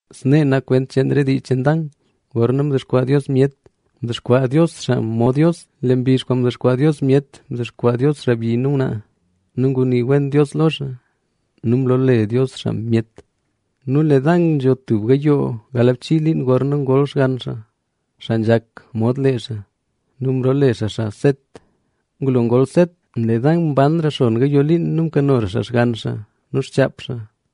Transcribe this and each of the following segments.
Snee nak kwent cheen re dii cheen Dan. Gorna mdexkwaa Dios myet, mdexkwaa Dios xaa mod Dios. Lee mbizh kwaan mdexkwaa Dios myet, mdexkwaa xaa xaabyi nu ngwnaa. Nu ngunii wen Dios lo xaa, nu mloole Dios xaa myet. Nu lee Dan nzho tub gayoo galbchii liin gorna ngol xgann xaa, xaa nzhak mod lee xaa. Nu mloole xaa xaa Set. Ngulo ngol Set, lee Dan mbanra xon gayoo liin nu mkanora xaa xgann xaa nu xchaap xaa.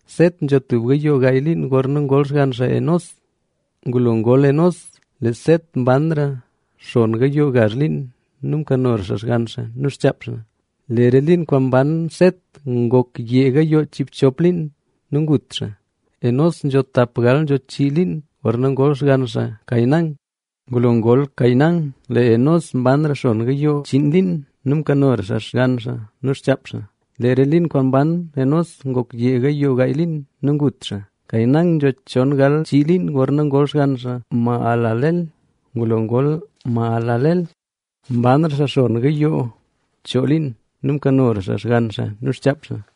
Set nzho tub gayoo gaay liin gorna ngol xgann xaa Enós. Ngulo ngol Enós, lee Set mbanra xon gayoo gazh liin nu mkanora xaa xgann xaa nu xchaap xaa. Lee re liin kwaan mban Set ngok yee gayoo chiibchop liin. Nu ngut xaa. Enós nzho tapgal nzho chii liin gorna ngol xgann xaa Cainán. Ngulo ngol Cainán, lee Enós mbanra xon gayoo chiin liin, nu mkanora xaa xgann xaa nu xchaap xaa. Lee re liin kwaan mban Enós ngok yee gayoo gaay liin. Nu ngut xaa. Cainán nzho chon gal chii liin gorna ngol xgann xaa Mahalaleel. Ngulo ngol Mahalaleel, mbanra xaa xon gayoo choo liin nu mkanora xaa xgann xaa nu xchaap xaa.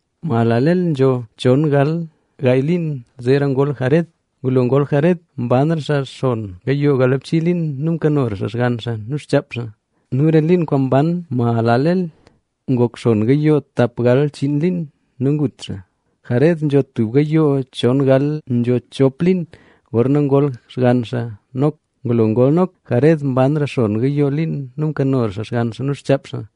Mahalaleel nzho chon gal gaay liin zeera ngol Jared. Ngulo ngol Jared, mbanra xaa xon gayoo galbchii liin, nu mkanora xaa xgann xaa nu xchaap xaa. Nu re liin kwaan mban Mahalaleel ngok xon gayoo tap gal chiin liin. Nu ngut xaa. Jared nzho tub gayoo chon gal nzho chop liin gorna ngol xgann xaa Nok. Ngulo ngol Nok, Jared mbanra xon gayoo liin nu mkanora xaa xgann xaa nu xchaap xaa.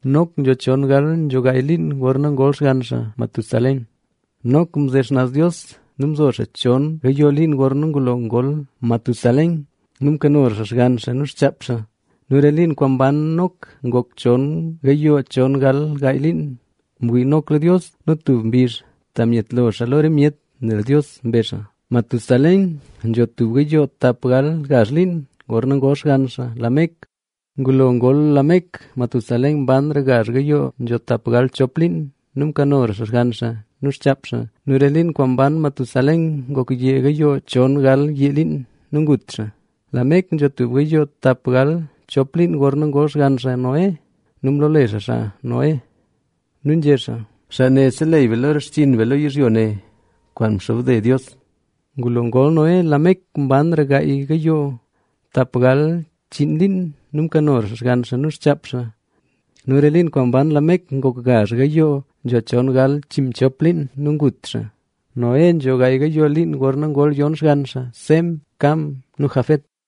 Nok nzho chon gal nzho gaay liin gorna ngol xgann xaa Matusalén. Nok mze xnaz Dios nu mzo xaa chon gayoo liin gorna ngulo ngol Matusalén nu mkanora xaa xgann xaa nu xchaap xaa. Nu re liin kwaan mban Nok ngok chon gayoo chon gal gaay liin. Mwii Nok lo Dios nu tub mbizh ta myetlo xaa lo re myet, nel Dios mbe xaa. Matusalén nzho tub gayoo tap gal gazh liin gorna ngol xgann xaa Lamec. Ngulo ngol Lamec, Matusalén mbanra gazh gayoo nzho tapgal chop liin nu mkanora xaa xgann xaa nu xchaap xaa. Nu re liin kwaan mban Matusalén ngok yee gayoo chon gal yee liin. Nu ngut xaa. Lamec nzho tub gayoo tap gal chop liin gorna ngol xgann xaa Noé. Nu mloole xaa xaa Noé,a nu nzhé xaa: “Xaa ne seleyy be lo re xchinn be lo yizhyo ne kwaan mxobde Dios”. Ngulo ngol Noé, Lamec mbanra gaay gayoo tapgal chiin liin nu mkanora xaa xgann xaa nu xchaap xaa. Nu re liin kwaan mban Lamec ngok gazh gayoo nzho chon gal chiinmchop liin. Nu gut xaa. Noé nzho gaay gayoo liin gorna ngol yon xgann xaa: Sem, Cam nu Jafet.